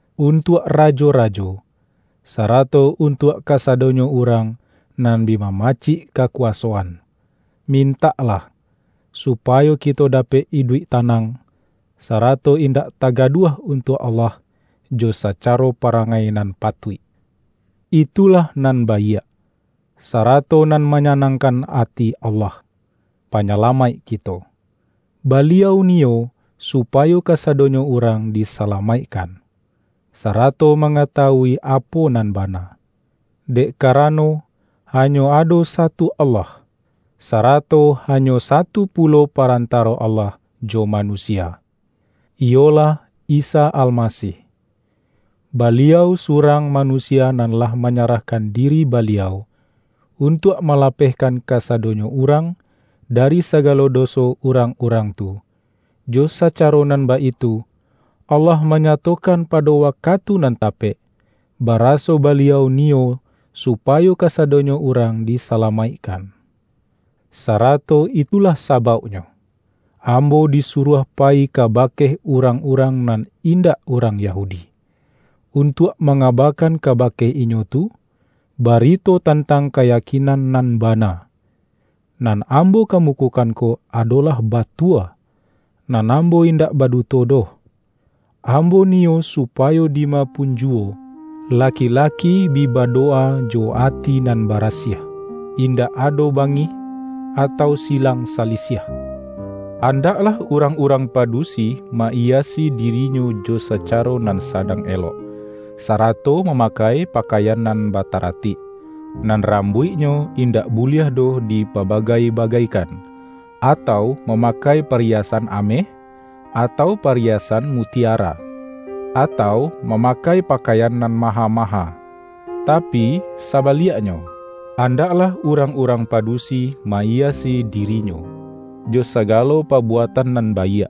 untuak rajo-rajo, sarato un-tuak kasadonyo urang nan bi mama-cik kakuwasoan. Mintaklah, supayo kito dapek iduik tanang, sarato in-dak tagaduah untuak Allah jo saca-ro parangai nan patuik. Itulah nan baiak, sarato nan manyanangkan ati Allah, Panyalamaik kito. Baliau ni-yo supayo kasadonyo urang disala-maikkan, sarato mangatawui apo nan bana. Dek karano, hanyo ado satu Allah, sarato hanyo satu pulo parantaro Allah jo manusia, iyolah Isa Almasih. Baliau surang manu-sia nan lah manyarahkan diri Ba-liau, untuak malapehkan kasadonyo urang dari sagalo doso urang-urang tu. Jo sacaro nan baitu, Allah manya-tokan pado wakatu nan tapek, ba-raso Baliau niyo supayo kasadonyo urang disalamaikkan. Sarato itulah sabauknyo, ambo disuruah payi ka-bake urang-urang nan indak urang Yahudi, untuak mangabakan kaba-ke inyo tu, barito tantang kayakin-an nan bana. Nan ambo kamukokan ko adolah batua, nan ambo indak baduto doh. Ambo niyo supayo di ma pun ju-wo laki-laki bi badowa jo ati nan barasiah, indak ado bangih atau si-lang salisiah. Andaklah urang-urang padusi ma-iyasi dirinyo jo sacaro nan sa-dang elok, sarato mamakai pakaian nan bataratik. Nan rambuiknyo in-dak buliah doh dipabagai-bagaikan, atau mamakai pariyasan ameh, atau pariyasan mutiara, atau mamakai pa-kaian nan maha-maha. Tapi saba-liaknyo, andaklah urang-urang padu-si ma-iyasi dirinyo jo sagalo pabuatan nan baiak,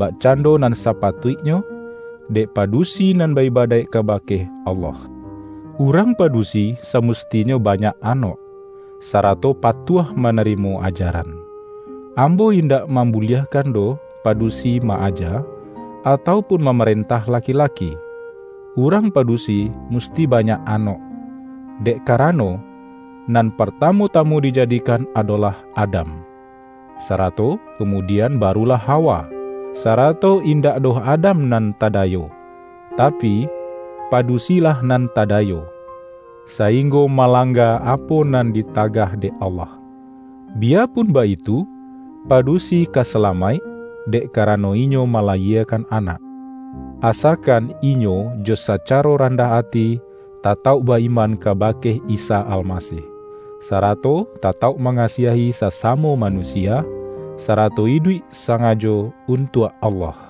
bakcando nan sapatuik-nyo dek padusi nan ba-ibadaik kaba-ke Allah. Urang padusi samustinyo banyak anok, sarato patuah manari-mo ajaran Ambo indak mambu-liahkan doh padusi ma-aja, atau pun mamarentah laki-laki; urang padu-si musti banyak anok. Dek karano, nan partamu-tamu dijadikan adolah Adam, sarato kamudian barulah Ha-wa. Sarato indak doh Adam nan ta-dayo, tapi, padusilah nan tadayo, sa-inggo malangga apo nan ditagah dek Allah. Biyapun baitu, padusi ka sa-lamaik, dek karano inyo malayiekan anak, asakan inyo jo sacaro randah ati, tatauk ba-iman kabake Isa Alma-sih, sarato tatauk mangasiahi sasamo manusia, sarato iduik sangajo untuak Allah.